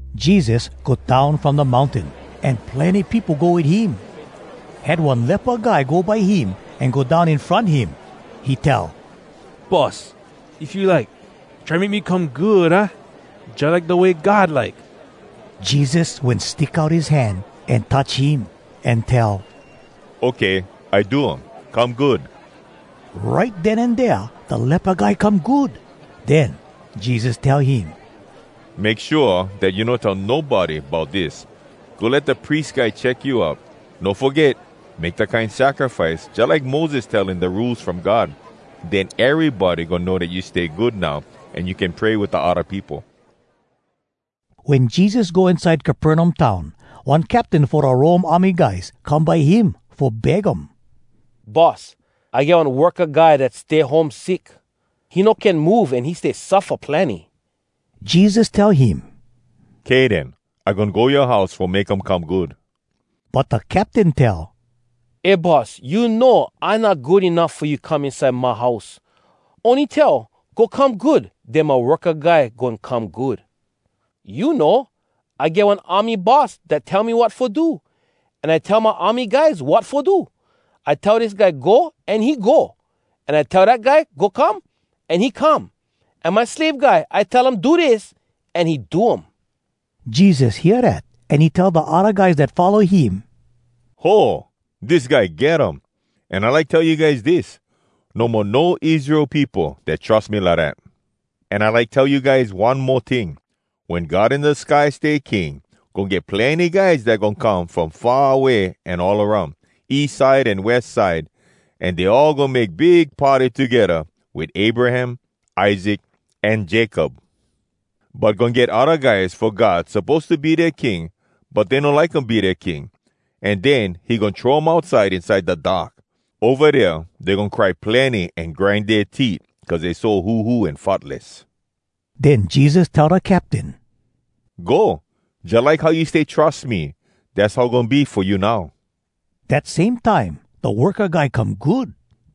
Jesus go down from da mountain, an plenny peopo go wit him. Had one lepa guy go by him an go down in front him. He tell, “Boss, if you like, try make me come good, aah? jalike da way God like.” Jesus wen stick out his hand an touch him, an tell, “Okay, I do um. Come good.” Right den an dea da lepa guy come good. Den Jesus tell him, “Make shua dat you no tell nobody bout dis. Go let da pries guy check you out. No foget make da kine sacrifice jalike Moses tell in da Rules From God. Den erybody goin know dat you stay good now, an you can pray wit da odda peopo.” Wen Jesus go inside Capernaum town, one captain fo da Rome army guys come by him fo beg um, “Boss, I get one worka guy dat stay home sick. He no can move, an he stay suffa plenny.” Jesus tell him, “Kay den. I goin go yoa house fo make him come good.” But da captain tell, “Eh Boss, you know, I not good enuff fo you fo come inside my house. Ony tell ‘Go come good,’ den my worka guy goin come good. You know, I get one army boss dat tell me wat fo do. An I tell my army guys wat fo do. I tell dis guy, ‘Go,’ an he go. An I tell dat guy, ‘Go come,’ an he come. An my slave guy, I tell um, ‘Do dis,’ an he do um.” Jesus hear dat, an he tell da odda guys dat follow him, “Ho! Dis guy get um! An I like tell you guys dis: no mo no Israel peopo dat trus me lidat! An I like tell you guys one mo ting: wen God in da sky stay King, goin get plenny guys dat goin come from far away an all aroun, east side an west side, an dey all goin make big party togedda wit Abraham, Isaac, an Jacob. But goin get odda guys fo God suppose to be dea King, but dey no like um be dea King. An den he goin throw um outside inside da dark. Ova dea dey goin cry plenny an grind dea teet cuz dey so huhu an futless.” Den Jesus tell da captain, “Go. Jalike how you stay trus me, dass how goin be fo you now.” Dat same time, da worka guy come good.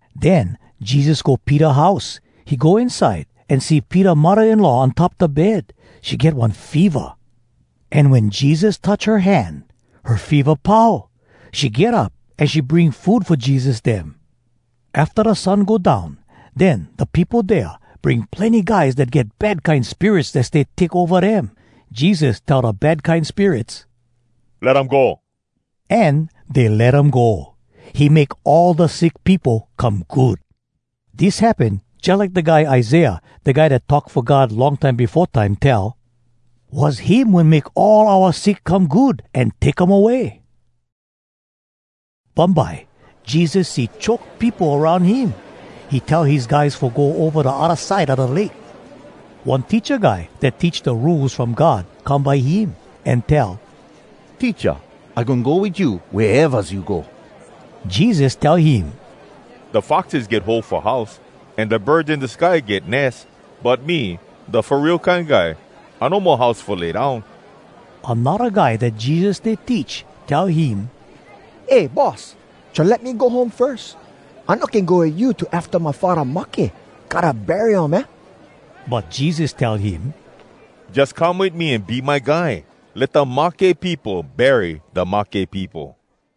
Den Jesus go Peter house. He go inside, an see Peter muddah-in-law on top da bed. She get one feva. An wen Jesus touch her hand, her feva pau. She get up an she bring food fo Jesus dem. Afta da sun go down, den da peopo dea bring plenny guys dat get bad kine spirits dat stay take ova dem. Jesus tell da bad kine spirits, “Let um go!” an dey let um go. He make all da sick peopo come good. Dis happen jalike da guy Isaiah, da guy dat talk fo God long time befo time, tell: “Was him wen make all oua sick come good an take um away.” Bumbye, Jesus see choke peopo aroun him. He tell his guys fo go ova da odda side a da lake. One teacha guy dat teach da Rules From God come by him, an tell, “Teacha, I goin go wit you wea evas you go.” Jesus tell him, “Da foxes get hole fo house, an da birds in da sky get nes. But me, da Fo Real Kine Guy, I no mo house fo lay down.” Anodda guy dat Jesus stay teach tell him, “Eh, Boss, try let me go home firs. I no can go wit you till afta my faddah mahke. Gotta bury um, aah?” But Jesus tell him, “Jus come wit me an be my guy! Let da mahke peopo bury da mahke peopo.”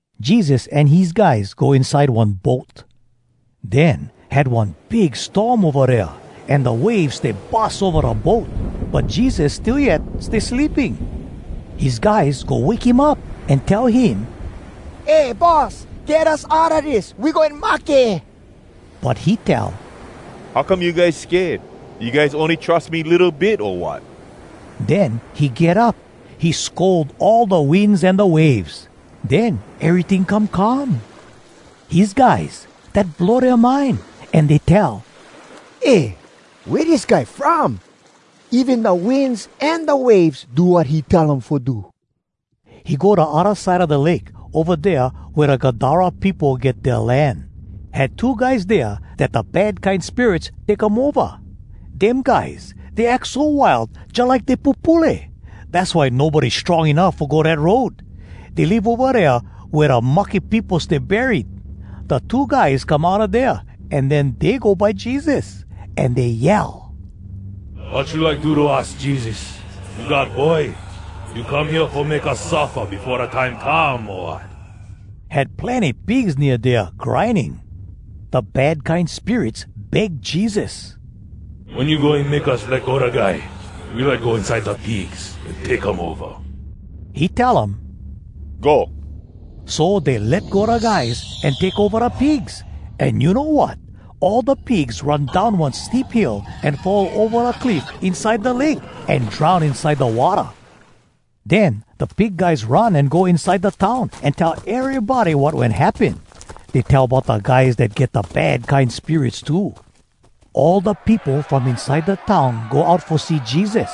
Jesus an his guys go inside one boat. Den had one big storm ova dea, an da waves stay bus ova da boat. But Jesus still yet stay sleeping. His guys go wake him up, an tell him, “Eh, Boss! Get us outa dis! We goin mahke!” But he tell, “How come you guys sked? You guys ony trus me litto bit, o wat?!” Den he get up. He scold all da winds an da waves. Den eryting come calm. His guys, dat blow dea mind, an dey tell, “Eh, wea dis guy from? Even da winds an da waves do wat he tell um fo do!” He go da odda side a da lake, ova dea wea da Gadara peopo get dea land. Had two guys dea dat da bad kine spirits take um ova. Dem guys, dey ack so wild, jalike dey pupule. Dass why nobody strong enuff fo go dat road. Dey live ova dea wea da mahke peopo stay buried. Da two guys come outa dea, an den dey go by Jesus. An dey yell, “Wat you like do to us, Jesus? You God Boy! You come hea fo make us suffa befo da time come, o wat?” Had plenny pigs nea dea, grinding. Da bad kine spirits beg Jesus, “Wen you goin make us let go da guy, we like go inside da pigs an take um ova.” He tell um, “Go.” So dey let go da guys, an take ova da pigs. An you know wat? All da pigs run down one steep hill an fall ova da cliff inside da lake, an drown inside da watta. Den da pig guys run, an go inside da town, an tell erybody wat wen happen. Dey tell bout da guys dat get da bad kine spirits too. All da peopo from inside da town go out fo see Jesus.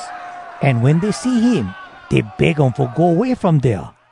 An wen dey see him, dey beg um fo go way from dea.